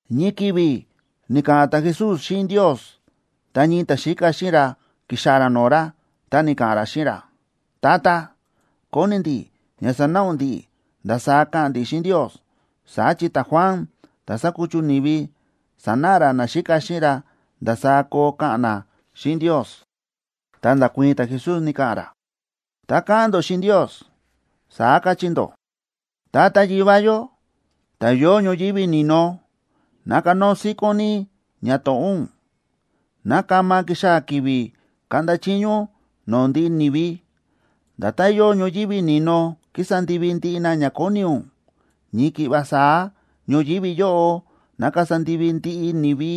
Ñii ki̱vi̱ ni̱ka̱ꞌa̱n ta̱Jesús xíꞌin Ndios, ta ñii ta̱xíka xíꞌin ra ki̱xaa̱ ra no̱o̱ ra, ta ni̱ka̱ꞌa̱n ra xíꞌin ra: ―Tata, kóni ndi̱ ña sanáꞌa ún ndi̱ꞌi̱ ndasaá ka̱ꞌa̱n ndi̱ xíꞌin Ndios, saá chi ta̱Juan ta̱ sa̱kuchu ni̱vi sa̱náꞌa ra naxíka xíꞌin ra ndasaá koo ka̱ꞌa̱n na xíꞌin Ndios. Ta nda̱kuii̱n ta̱Jesús, ni̱ka̱ꞌa̱n ra: ―Tá káꞌa̱n ndó xíꞌin Ndios, saá kachí ndó: Tata Yivá yó, ta̱ yóo ñoyívi ni̱no, ná kanóo síkón ní ñato̱ꞌó ún. Ná kama kixaa̱ ki̱vi̱ kaꞌnda chiño ún no̱o̱ ndiꞌi ni̱vi. Nda̱tán yóo ñoyívi ni̱no kísa ndivi ndiꞌi na ña kóni ún, ñii ki̱ꞌva saá ñoyívi yóꞌo ná kasa ndivi ndiꞌi ni̱vi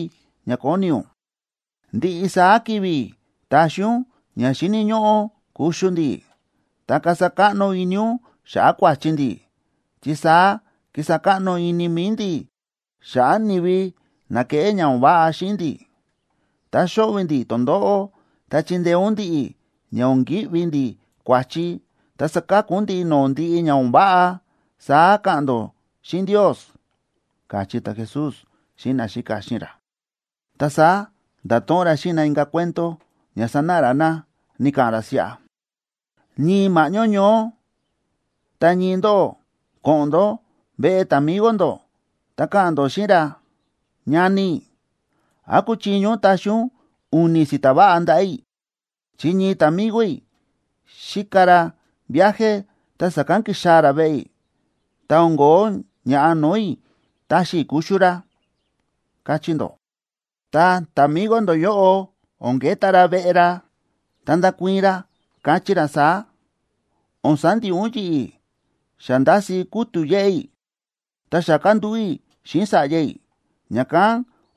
ña kóni ún. Ndiꞌi saá ki̱vi̱ taxi ún ña xíni̱ ñóꞌó kuxu ndi̱. Ta kasa káꞌno ini ún xa̱ꞌa̱ kua̱chi ndi̱, chi saá kísa káꞌno ini mi̱i ndi̱ xa̱ꞌa̱ ni̱vi na kéꞌé ña o̱n váꞌa xíꞌin ndi̱. Tá xóꞌvi̱ ndi̱ tondóꞌó, ta chindeé ún ndi̱ꞌi̱ ña o̱n ki̱ꞌvi ndi̱ kua̱chi, ta saka̱ku ún ndi̱ꞌi̱ no̱o̱ ndiꞌi ña o̱n váꞌa, saá ka̱ꞌa̱n ndó xíꞌin Ndios ―káchí ta̱Jesús xíꞌin naxíka xíꞌin ra. Ta saá nda̱to̱ꞌon ra xíꞌin na inka̱ cuento ña sanáꞌa ra na, ni̱ka̱ꞌa̱n ra siꞌa: ―Ñii ma̱ꞌñó ñoó, ta ñii ndóꞌó ko̱ꞌo̱n ndó veꞌe ta̱migo ndó, ta ka̱ꞌa̱n ndó xíꞌin ra: “Ñani, ¿án kúchiño ún taxi ún u̱ni̱ si̱ta̱ váꞌa ndaꞌa̱ i̱?, chi ñii ta̱migo i̱ xíka ra viaje, ta sa̱kán ki̱xaa̱ ra veꞌe i̱, ta o̱n ko̱ó ña̱ꞌa no̱o̱ i̱ taxi i̱ kuxu ra”, kachí ndó. Ta ta̱migo ndó yóꞌo o̱n keta ra veꞌe ra, ta ndakuii̱n ra, kachí ra saá: “O̱n sandiꞌi ún yi̱ꞌi̱. Xa ndási kútu̱ yéꞌé i̱, ta xa kándúꞌu̱ i̱ xíꞌin sa̱ꞌya i̱, ña̱kán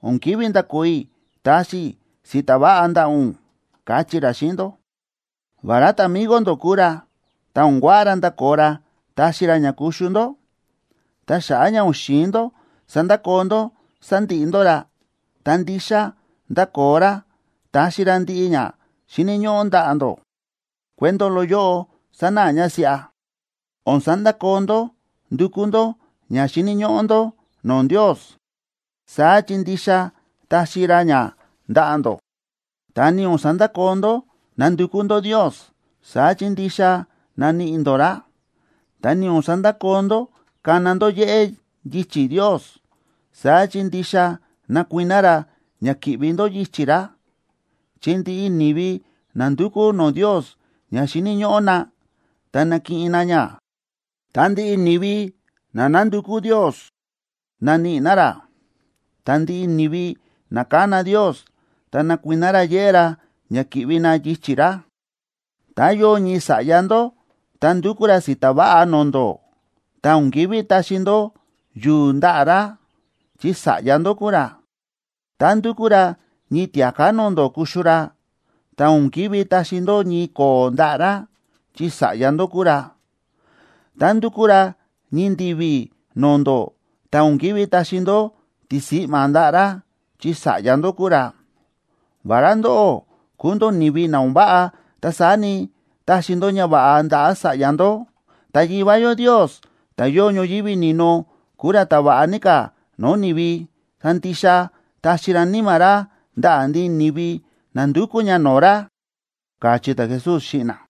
o̱n ki̱ví ndakoo i̱ taxi i̱ si̱ta̱ váꞌa ndaꞌa̱ ún”, kachí ra xíꞌin ndó. Vará ta̱migo ndó kúu ra, ta o̱n kuaꞌa ra ndakoo ra taxi ra ña kuxu ndó. Ta xa̱ꞌa̱ ña o̱n xi̱in ndó sandakoo ndó sandiꞌi ndó ra, ta ndixa ndakoo ra taxi ra ndiꞌi ña xíni̱ ñóꞌó ndaꞌa̱ ndó. Cuento loꞌo yóꞌo sánáꞌa ña siꞌa: O̱n sandakoo ndó ndúkú ndó ña xíni̱ ñóꞌó ndó no̱o̱ Ndios, saá chi ndixa taxi ra ña ndaꞌa̱ ndó. Ta ni o̱n sandakoo ndó nándukú ndó Ndios, saá chi ndixa naníꞌi ndó ra. Ta ni o̱n sandakoo ndó kána ndó yéꞌé yichi̱ Ndios, saá chi ndixa nakuiná ra ña ki̱ꞌvi ndó yichi̱ ra. Chi ndiꞌi ni̱vi na ndúkú no̱o̱ Ndios ña xíni̱ ñóꞌó na, ta nakiꞌin na ña. Ta ndiꞌi ni̱vi na nándukú Ndios, naníꞌi na ra. Ta ndiꞌi ni̱vi na kána Ndios, ta nakuiná ra yéꞌé ra ña ki̱ꞌvi na yichi̱ ra. ’Tá yóo ñii sa̱ꞌya ndó, tá ndúkú ra si̱ta̱ váꞌa no̱o̱ ndó, ta o̱n ki̱ví taxi ndó yu̱u̱ ndaꞌa̱ ra, chi sa̱ꞌya ndó kúu ra. Tá ndúkú ra ñii tia̱ká no̱o̱ ndó kuxu ra, ta o̱n ki̱ví taxi ndó ñii ko̱o̱ ndaꞌa̱ ra, chi sa̱ꞌya ndó kúu ra. Tá ndúkú ra ñii ndi̱vi̱ no̱o̱ ndó, ta o̱n ki̱ví taxi ndó tisi̱ꞌma̱ ndaꞌa̱ ra, chi sa̱ꞌya ndó kúu ra. Vará ndóꞌó kúu ndó ni̱vi na o̱n váꞌa, ta saá ni, táxi ndó ñava̱ꞌa ndaꞌa̱ sa̱ꞌya ndó. Ta Yivá yó Ndios, ta̱ yóo ñoyívi ni̱no, kúu ra ta̱ va̱ꞌa ní ka̱ no̱o̱ ni̱vi, ta ndixa taxi ra Níma̱ ra ndaꞌa̱ ndiꞌi ni̱vi na ndukú ña no̱o̱ ra ―káchí ta̱Jesús xíꞌin na.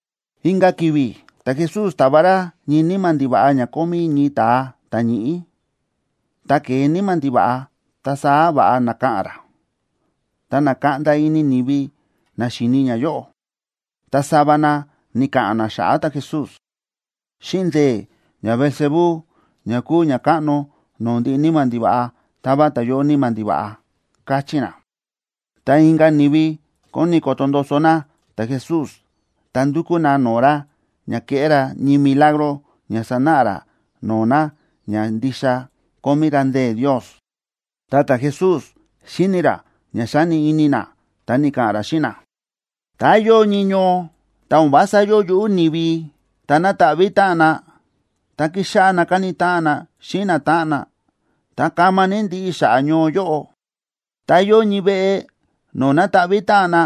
Inka̱ ki̱vi̱ ta̱Jesús táva ra ñii níma̱ ndiva̱ꞌa ña kómí ñii ta̱a ta̱ ñíꞌí. Tá ke̱e níma̱ ndiva̱ꞌa, ta saá va̱ꞌa na̱ka̱ꞌa̱n ra. Ta na̱kaꞌnda ini ni̱vi na xíni ñayóꞌo. Ta sava na ni̱ka̱ꞌa̱n na xa̱ꞌa̱ ta̱Jesús: ―Xíꞌin ndee̱ ñaBeelzebú,a ña kúu ñakáꞌno no̱o̱ ndiꞌi níma̱ ndiva̱ꞌa, táva ta̱yóꞌo níma̱ ndiva̱ꞌa ―káchí na. Ta inka̱ ni̱vi kóni koto ndoso na ta̱Jesús, ta ndu̱kú na no̱o̱ ra ña keꞌé ra ñii milagro ña sanáꞌa ra no̱o̱ na ña ndixa kómí ra ndee̱ Ndios. Ta ta̱Jesús xíni̱ ra ña xáni ini na, ta ni̱ka̱ꞌa̱n ra xíꞌin na: ―Tá yóo ñii ñoo, ta o̱n vása yóo yuꞌú ni̱vi, ta na̱taꞌví táꞌan na, ta ki̱xáꞌá na káni táꞌan na xíꞌin natáꞌan na, ta kama ní ndiꞌi xa̱ꞌa̱ ñoo yóꞌo. Tá yóo ñii veꞌe no̱o̱ na̱taꞌví táꞌan na,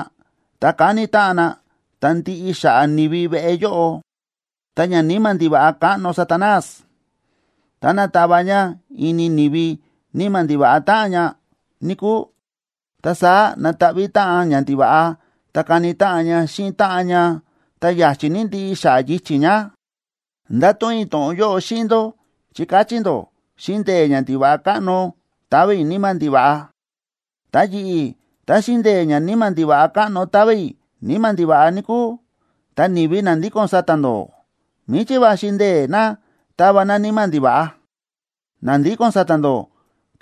ta káni táꞌan na, ta ndiꞌi xa̱ꞌa̱ ni̱vi veꞌe yóꞌo. Ta ñaníma̱ ndiva̱ꞌa káꞌno Satanás, táná tava ña ini ni̱vi níma̱ ndiva̱ꞌa táꞌan ña, níkúu, ta saá nataꞌví táꞌan ñandiva̱ꞌa ta kani táꞌan ña xíꞌin táꞌan ña, ta ya̱chi̱ ní ndiꞌi xa̱ꞌa̱ yichi̱ ña. Ndáto̱ꞌon i̱ to̱ꞌon yóꞌo xíꞌin ndó, chi káchí ndó xíꞌin ndee̱ ñandiva̱ꞌa káꞌno táva i̱ níma̱ ndiva̱ꞌa. Ta yi̱ꞌi̱, tá xíꞌin ndee̱ ñaníma̱ ndiva̱ꞌa káꞌno táva i̱ níma̱ ndiva̱ꞌa, níkúu, ta ni̱vi na ndíko̱n sa̱ta̱ ndó, ¿míchí va̱xi ndee̱ na táva na níma̱ ndiva̱ꞌa? Na ndíko̱n sa̱ta̱ ndó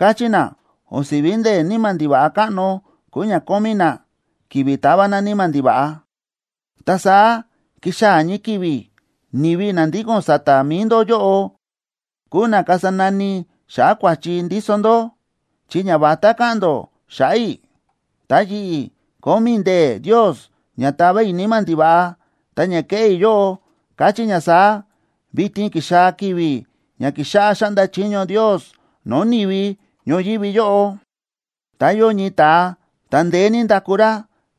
káchí na o̱n si̱ví ndee̱ níma̱ ndiva̱ꞌa káꞌno kúu ña kómí na kivi tava na níma̱ ndiva̱ꞌa. Ta saá kixaa̱ ñii ki̱vi̱ ni̱vi na ndíko̱n sa̱ta̱ mi̱i ndó yóꞌo kuu na kasa nani xa̱ꞌa̱ kua̱chi ndíso ndó, chi ñavatá káꞌa̱n ndó xa̱ꞌa̱ i̱. Ta yi̱ꞌi̱, kómí i̱ ndee̱ Ndios ña tava i̱ níma̱ ndiva̱ꞌa, ta ña kéꞌé i̱ yóꞌo káchí ña saá: vitin ki̱xaa̱ ki̱vi̱ ña kíxáꞌá xáꞌnda chiño Ndios no̱o̱ ni̱vi ñoyívi yóꞌo. ’Tá yóo ñii ta̱a ta̱ ndeé ní ndaku ra,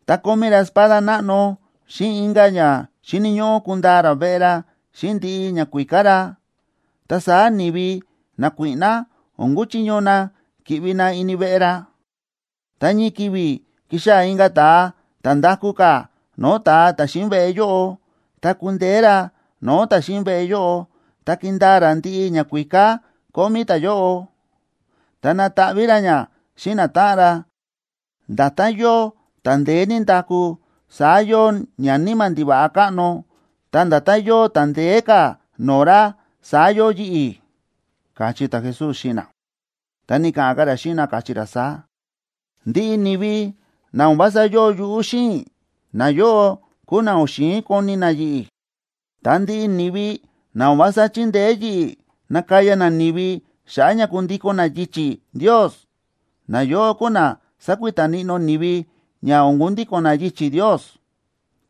ta kómí ra espada náꞌno xíꞌin inka̱ ña xíni̱ ñóꞌó kundaa ra veꞌe ra xíꞌin ndiꞌi ñakuíká ra, ta saá ni̱vi nakuíꞌná o̱n kuchiño na ki̱ꞌvi na ini veꞌe ra. Tá ñii ki̱vi̱ kixaa̱ inka̱ ta̱a ta̱ ndaku ka̱ no̱o̱ ta̱a ta̱ xíꞌin veꞌe yóꞌo, ta kundeé ra no̱o̱ ta̱ xíꞌin veꞌe yóꞌo, ta kindaa ra ndiꞌi ñakuíká kómí ta̱yóꞌo, ta nataꞌví ra ña xíꞌin natáꞌan ra. Nda̱tán yóo ta̱ ndeé ní ndaku, saá yóo ñaníma̱ ndiva̱ꞌa káꞌno. Ta nda̱tán yóo ta̱ ndeé ka̱ no̱o̱ ra, saá yóo yi̱ꞌi̱ ―káchí ta̱Jesús xíꞌin na. Ta ni̱ka̱ꞌa̱n ka̱ ra xíꞌin na, káchí ra saá: ―Ndiꞌi ni̱vi na o̱n vása yóo yuꞌú xíꞌin i̱, nayóꞌo kúu na o̱n xi̱in koni na yi̱ꞌi̱. Ta ndiꞌi ni̱vi na o̱n vása chíndeé yi̱ꞌi̱ nakaya na ni̱vi xa̱ꞌa̱ ña kundíko̱n na yichi̱ Ndios, nayóꞌo kúu na sakuita níꞌnó ni̱vi ña o̱n kundíko̱n na yichi̱ Ndios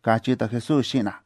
―káchí ta̱Jesús xíꞌin na.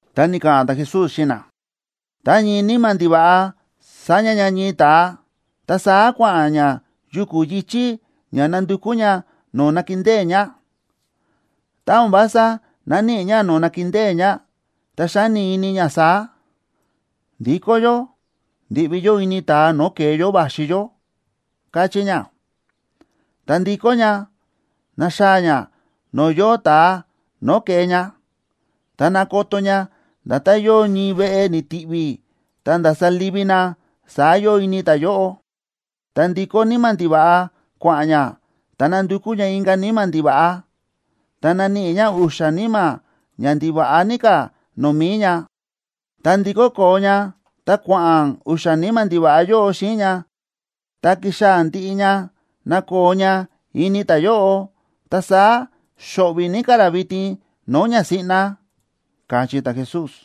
Ta ni̱ka̱ꞌa̱n ta̱Jesús xíꞌin na: ―Tá ñii níma̱ ndiva̱ꞌa sáña ña ñii ta̱a, ta saá kua̱ꞌa̱n ña yuku̱ yi̱chí ña nandukú ña no̱o̱ nakindée ña. Tá o̱n vása náníꞌi ña no̱o̱ nakindée ña, ta xáni ini ña saá: “Ndikó yó ndi̱ꞌvi yó ini ta̱a no̱o̱ ke̱e yó va̱xi yó”, káchí ña. Ta ndíkó ña, náxaa̱ ña no̱o̱ yóo ta̱a no̱o̱ ke̱e ña. Ta nákoto ña, nda̱tán yóo ñii veꞌe ni̱ti̱ví ta nda̱sa livi na, saá yóo ini ta̱yóꞌo. Ta ndíkó níma̱ ndiva̱ꞌa kua̱ꞌa̱n ña, ta nándukú ña inka̱ níma̱ ndiva̱ꞌa. Ta náníꞌi ña u̱xa̱ níma̱ ña ndiva̱ꞌa ní ka̱ no̱o̱ mi̱i ña. Ta ndíkó koo ña ta kua̱ꞌa̱n u̱xa̱ níma̱ ndiva̱ꞌa yóꞌo xíꞌin ña ta kíxaa̱ ndiꞌi ña nakoo ña ini ta̱yóꞌo. Ta saá xóꞌvi̱ ní ka̱ ra vitin no̱o̱ ña siꞌna ―káchí ta̱Jesús.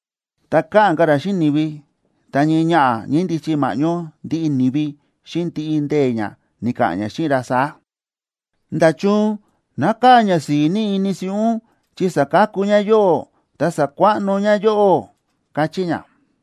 Tá káꞌa̱n ka̱ ra xíꞌin ni̱vi, ta ñii ñaꞌa̱ ñá ñíndichi ma̱ꞌñó ndiꞌi ni̱vi, xíꞌin ndiꞌi ndee̱ ñá ni̱ka̱ꞌa̱n ñá xíꞌin ra saá: ―¡Nda̱chun nákaa̱ ñasi̱i̱ ní ini siꞌí ún, chi sa̱kaku ñá yóꞌó ta sa̱kuaꞌno ñá yóꞌó! ―káchí ñá.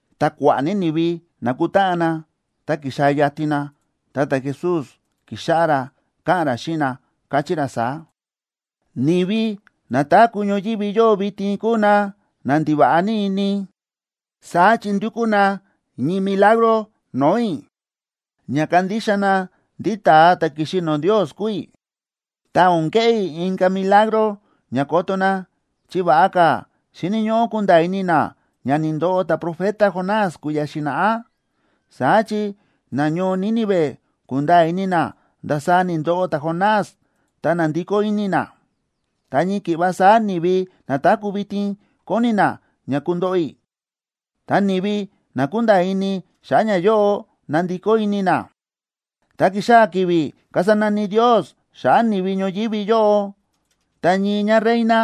Tá kua̱ꞌa̱ ní ni̱vi na̱kutáꞌan na ta ki̱xaa̱ yatin na, ta ta̱Jesús ki̱xáꞌá ra káꞌa̱n ra xíꞌin na, káchí ra saá: ―Ni̱vi na táku̱ ñoyívi yóꞌo vitin kúu na na ndiva̱ꞌa ní ini. Saá chi ndúkú na ñii milagro no̱o̱ i̱ ña kandixa na ndí ta̱a ta̱ ki̱xi no̱o̱ Ndios kúu i̱. Ta o̱n keꞌé i̱ inka̱ milagro ña koto na, chi va̱ꞌa ka̱ xíni̱ ñóꞌó kunda̱a̱ ini na ña ni̱ndoꞌo ta̱profeta Jonás kui̱ya̱ xi̱na̱ꞌá. Saá chi nañoo Nínive ku̱nda̱a̱ ini na ndasaá ni̱ndoꞌo ta̱Jonás, ta na̱ndikó ini na. Ta ñii ki̱ꞌva saá ni̱vi na táku̱ vitin koni na ña kundoꞌo i̱, ta ni̱vi na kunda̱a̱ ini xa̱ꞌa̱ ñayóꞌo nandikó ini na. Tá kixaa̱ ki̱vi̱ kasa nani Ndios xa̱ꞌa̱ ni̱vi ñoyívi yóꞌo, ta ñii ñáreina,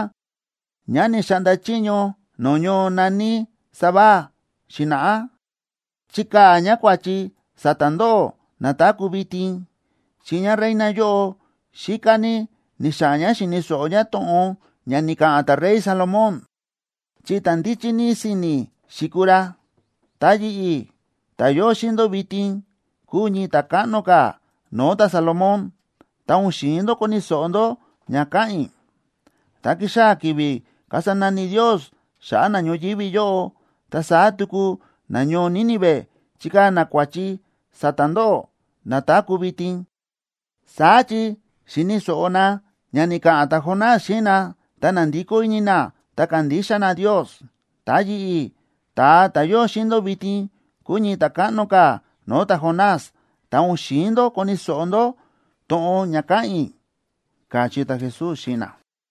ñá ni̱xaꞌnda chiño no̱o̱ ñoo na̱ní Sabá xi̱na̱ꞌá, chikaa̱ ñá kua̱chi sa̱ta̱ ndóꞌó na táku̱ vitin. Chi ñáreina yóꞌo xíká ní ni̱xa̱ꞌa̱n ñá xi̱ni̱ so̱ꞌo ñá to̱ꞌon ña ni̱ka̱ꞌa̱n ta̱rey Salomón, chi ta̱ ndíchí ní si̱ni̱ xi̱kuu ra. Ta yi̱ꞌi̱, ta̱ yóo xíꞌin ndó vitin, kúu ñii ta̱káꞌno ka̱ no̱o̱ ta̱Salomón, ta o̱n xi̱in ndó koni̱ so̱ꞌo ndó ña káꞌa̱n i̱. Tá kixaa̱ ki̱vi̱ kasa nani Ndios xa̱ꞌa̱ na ñoyívi yóꞌo, ta saá tuku nañoo Nínive chikaa̱ na kua̱chi sa̱ta̱ ndóꞌó na táku̱ vitin. Saá chi xi̱ni̱ so̱ꞌo na ña ni̱ka̱ꞌa̱n ta̱Jonás xíꞌin na, ta na̱ndikó ini na ta ka̱ndixa na Ndios. Ta yi̱ꞌi̱, ta̱a ta̱ yóo xíꞌin ndó vitin, kúu ñii ta̱káꞌno ka̱ no̱o̱ ta̱Jonás, ta o̱n xi̱in ndó koni̱ so̱ꞌo ndó to̱ꞌon ña káꞌa̱n i̱ ―káchí ta̱Jesús xíꞌin na.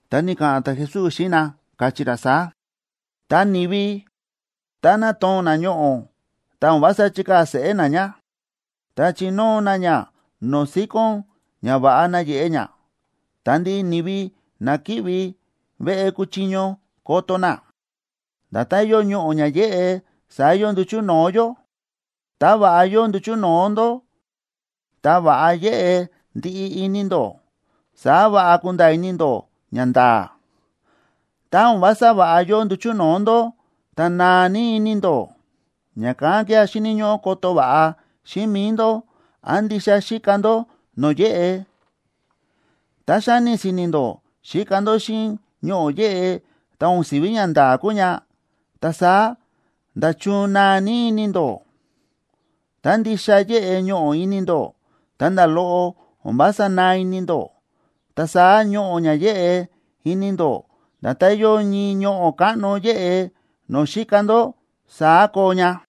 Ta ni̱ka̱ꞌa̱n ta̱Jesús xíꞌin na, káchí ra saá: ―Ta ni̱vi, tá nátoo̱n na ñoꞌo̱, ta o̱n vása chíkaa̱ seꞌé na ña, ta chínóo na ña no̱o̱ síkón ña va̱ꞌa nayeꞌe ña, ta ndiꞌi ni̱vi na ki̱ꞌvi veꞌe kuchiño koto na. Nda̱tán yóo ñoꞌo̱ ña yéꞌe, saá yóo nduchu̱ no̱o̱ yó. Tá va̱ꞌa yóo nduchu̱ no̱o̱ ndó, ta va̱ꞌa yéꞌe ndiꞌi ini ndó, saá va̱ꞌa kúnda̱a̱ ini ndó ñanda̱a̱. Tá o̱n vása va̱ꞌa yóo nduchu̱ no̱o̱ ndó, ta naa ní ini ndó. Ña̱kán kía̱ xíni̱ ñóꞌó koto va̱ꞌa xíꞌin mi̱i ndó án ndixa xíka ndó no̱o̱ yéꞌe. Tá xáni si̱ni̱ ndó xíka ndó xíꞌin ñoꞌo̱ yéꞌe, ta o̱n si̱ví ñanda̱a̱ kúu ña, ta saá, ¡nda̱chun naa ní ini ndó! Tá ndixa yéꞌe ñoꞌo̱ ini ndó, ta nda̱ loꞌo o̱n vása naa ini ndó, ta saá ñoꞌo̱ ña yéꞌe ini ndó nda̱tán yóo ñii ñoꞌo̱ káꞌno yéꞌe no̱o̱ xíka ndó, saá koo ña.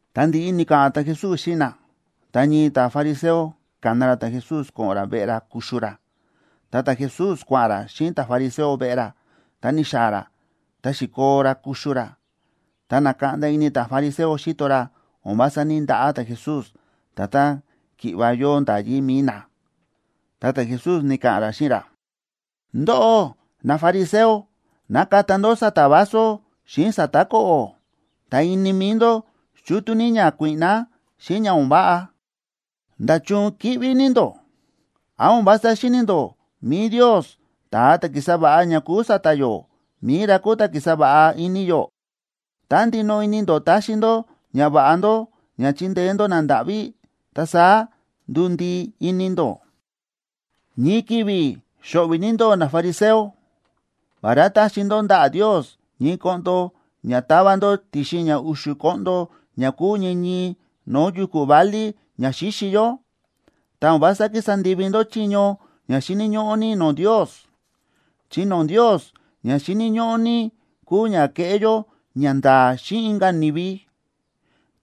Ta ndi̱ꞌi ni̱ka̱ꞌa̱n ta̱Jesús xíꞌin na, ta ñii ta̱fariseo ka̱na ra ta̱Jesús ko̱ꞌo̱n ra veꞌe ra kuxu ra. Ta ta̱Jesús kua̱ꞌa̱n ra xíꞌin ta̱fariseo veꞌe ra, ta ni̱xaa̱ ra, ta xi̱koo ra kuxu ra. Ta na̱kaꞌnda ini ta̱fariseo xíto ra o̱n vása ní‑ndaꞌá ta̱Jesús, nda̱tán ki̱ꞌva yóo nda̱yí mi̱i na. Ta ta̱Jesús ni̱ka̱ꞌa̱n ra xíꞌin ra: ―Ndóꞌó nafariseo nákata ndó sa̱ta̱ vaso xíꞌin sa̱ta̱ ko̱ꞌo̱. Ta ini mi̱i ndó chútú ní ña kuíꞌná xíꞌin ña o̱n váꞌa. ¡Nda̱chun kíꞌví ní ndó! ¿Án o̱n vása xíni̱ ndó mi̱i Ndios, ta̱a ta̱ ki̱sa va̱ꞌa ña kúu sa̱ta̱ yó, mi̱i ra kúu ta̱ ki̱sa va̱ꞌa ini yó? Tá ndinoꞌo ini ndó taxi ndó ñava̱ꞌa ndó ña chindeé ndó nandáꞌví, ta saá nduu ndii ini ndó. ’¡Ñii ki̱vi̱ xo̱ꞌvi̱ ní ndóꞌó, nafariseo! Vará táxi ndó ndaꞌa̱ Ndios ñii koꞌndo ña ta̱va ndó ti̱xin ña u̱xu̱ koꞌndo ña kúu ñii ñii no̱o̱ yu̱ku̱ válí ña xíxi yó,b ta o̱n vása kísa ndivi ndó chiño ña xíni̱ ñóꞌó ní no̱o̱ Ndios. Chi no̱o̱ Ndios ña xíni̱ ñóꞌó ní kúu ña keꞌé yó ñanda̱a̱ xíꞌin inka̱ ni̱vi,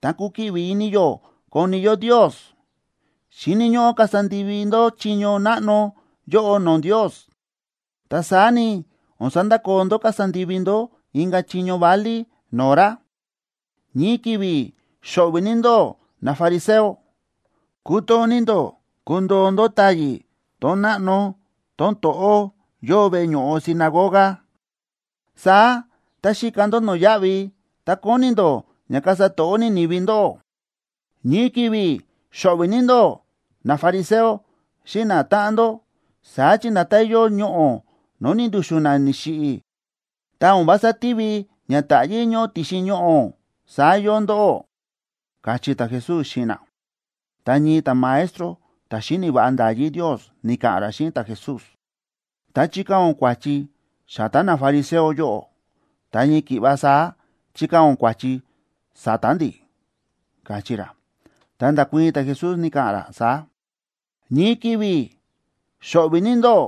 ta kukiꞌvi ini yó koni yó Ndios. Xíni̱ ñóꞌó kasa ndivi ndó chiño náꞌno yóꞌo no̱o̱ Ndios, ta saá ni, o̱n sandakoo ndó kasa ndivi ndó inka̱ chiño válí no̱o̱ ra. ’¡Ñii ki̱vi̱ xo̱ꞌvi̱ ní ndóꞌó, nafariseo! Kútoo ní ndó kundoo ndó táyi̱ tón náꞌno tón to̱ꞌó yóo veꞌe ño̱ꞌo sinagoga. Saá tá xíka ndó no̱yáꞌvi, ta kóni ndó ña kasa to̱ꞌó ní ni̱vi ndóꞌó. ’¡Ñii ki̱vi̱ xo̱ꞌvi̱ ní ndóꞌó, nafariseo xíꞌin natáꞌan ndó! Saá chi nda̱tán yóo ñoꞌo̱ no̱o̱ ni̱ndu̱xu̱n na ni̱xiꞌi̱, ta o̱n vása tívi ña táꞌyí ñóꞌo ti̱xin ñoꞌo̱, saá yóo ndóꞌó ―káchí ta̱Jesús xíꞌin na. Ta ñii ta̱maestro ta̱ xíni̱ va̱ꞌa nda̱yí Ndios ni̱ka̱ꞌa̱n ra xíꞌin ta̱Jesús: ―Tá chíkaa̱ ún kua̱chi sa̱ta̱ nafariseo yóꞌo, ta ñii ki̱ꞌva saá chíkaa̱ ún kua̱chi sa̱ta̱ ndi̱ ―káchí ra. Ta nda̱kuii̱n ta̱Jesús, ni̱ka̱ꞌa̱n ra saá: ―¡Ñii ki̱vi̱ xo̱ꞌvi̱ ní ndóꞌó,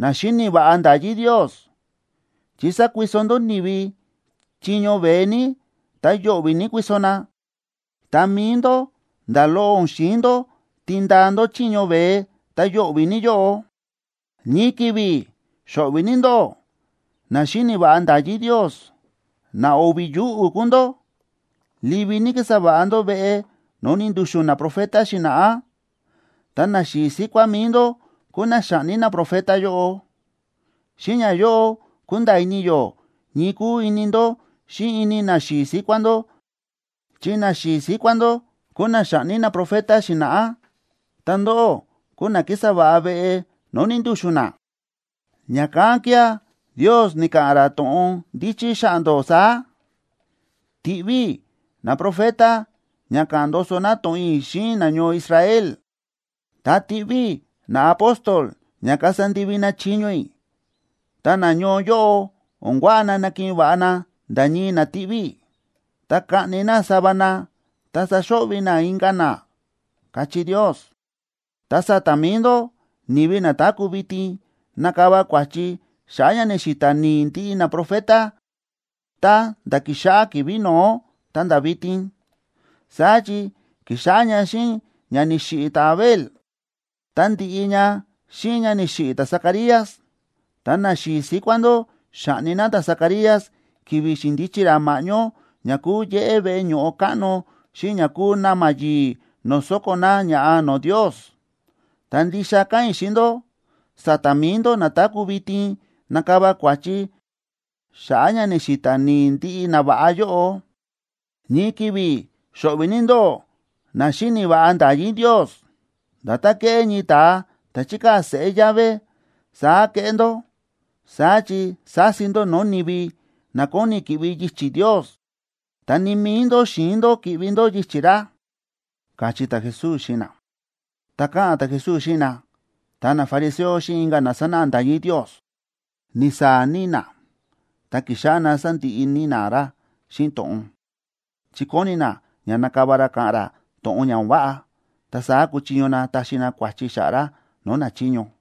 na xíni̱ va̱ꞌa nda̱yí Ndios! Chi sákuiso ndó ni̱vi chiño veé ní, ta yo̱ꞌvi̱ ní kuiso na. Ta mi̱i ndó, nda̱ loꞌo o̱n xi̱in ndó tindaa ndó chiño veé ta yo̱ꞌvi̱ ní yóꞌo. ’¡Ñii ki̱vi̱ xo̱ꞌvi̱ ní ndóꞌó, na xíni̱ va̱ꞌa nda̱yí Ndios! ¡Na o̱vi̱ yuꞌu̱ kúu ndó! Livi ní kísa va̱ꞌa ndó veꞌe no̱o̱ ni̱ndu̱xu̱n naprofeta xi̱na̱ꞌá. Ta naxi̱i̱ síkuá mi̱i ndó kúu na xa̱ꞌni naprofeta yóꞌo. Xíꞌin ñayóꞌo kúnda̱a̱ ini yó ñii kúu ini ndó xíꞌin ini naxi̱i̱ síkuá ndó. Chi naxi̱i̱ síkuá ndó kúu na xa̱ꞌni naprofeta xi̱na̱ꞌá, ta ndóꞌó kúu na kísa va̱ꞌa veꞌe no̱o̱ ni̱ndu̱xu̱n na. ’Ña̱kán kía̱ Ndios ni̱ka̱ꞌa̱n ra to̱ꞌon ndíchí xa̱ꞌa̱ ndó saá: “Tiꞌví i̱ naprofeta ña ka̱ꞌa̱n ndoso na to̱ꞌon i̱ xíꞌin nañoo Israel, ta tiꞌví i̱ naapóstol ña kasa ndivi na chiño i̱, ta nañoo yóꞌo, o̱n kuaꞌa na nakiꞌin va̱ꞌa na nda̱ ñii na tiꞌví i̱, ta kaꞌni na sava na, ta saxo̱ꞌvi̱ na inka̱ na”, káchí Ndios. Ta sa̱ta̱ mi̱i ndó ni̱vi na táku̱ vitin, nakava kua̱chi xa̱ꞌa̱ ña ni̱xi̱ta̱ ni̱i̱ ndiꞌi naprofeta, tá nda̱ ki̱xáꞌá ki̱vi̱ no̱ó ta̱nda̱ vitin. Saá chi ki̱xáꞌá ña xíꞌin ña ni̱xiꞌi̱ ta̱Abel,c ta ndi̱ꞌi ña xíꞌin ña ni̱xiꞌi̱ ta̱Zacarías. Ta naxi̱i̱ síkuá ndó xa̱ꞌni na ta̱Zacarías ki̱vi̱ xi̱ndichi ra ma̱ꞌñó ña kúu yéꞌé veꞌe ño̱ꞌo káꞌno xíꞌin ña kúu na̱ma̱ yi̱i̱ no̱o̱ sóko̱ na ña̱ꞌa no̱o̱ Ndios. Ta ndixa káꞌa̱n i̱ xíꞌin ndó, sa̱ta̱ mi̱i ndó na táku̱ vitin, nakava kua̱chi xa̱ꞌa̱ ña ni̱xi̱ta̱ ni̱i̱ ndiꞌi nava̱ꞌa yóꞌo. ’¡Ñii ki̱vi̱ xo̱ꞌvi̱ ní ndóꞌó, na xíni̱ va̱ꞌa nda̱yí Ndios! Nda̱tán kéꞌé ñii ta̱a ta̱ chíkaa̱ seꞌé llave, saá kéꞌé ndó. Saá chi sási ndó no̱o̱ ni̱vi na kóni ki̱ꞌvi yichi̱ Ndios, ta ni mi̱i ndó xi̱in ndó ki̱ꞌvi ndó yichi̱ ra ―káchí ta̱Jesús xíꞌin na. Tá káꞌa̱n ta̱Jesús xíꞌin na, ta nafariseo xíꞌin inka̱ na sánáꞌa nda̱yí Ndios, ni̱saa̱ ní na, ta ki̱xáꞌá na sándiꞌi ní na ra xíꞌin to̱ꞌon, chi kóni na ña nakava ra ka̱ꞌa̱n ra to̱ꞌon ña o̱n váꞌa, ta saá kuchiño na taxi na kua̱chi xa̱ꞌa̱ ra no̱o̱ nachiño.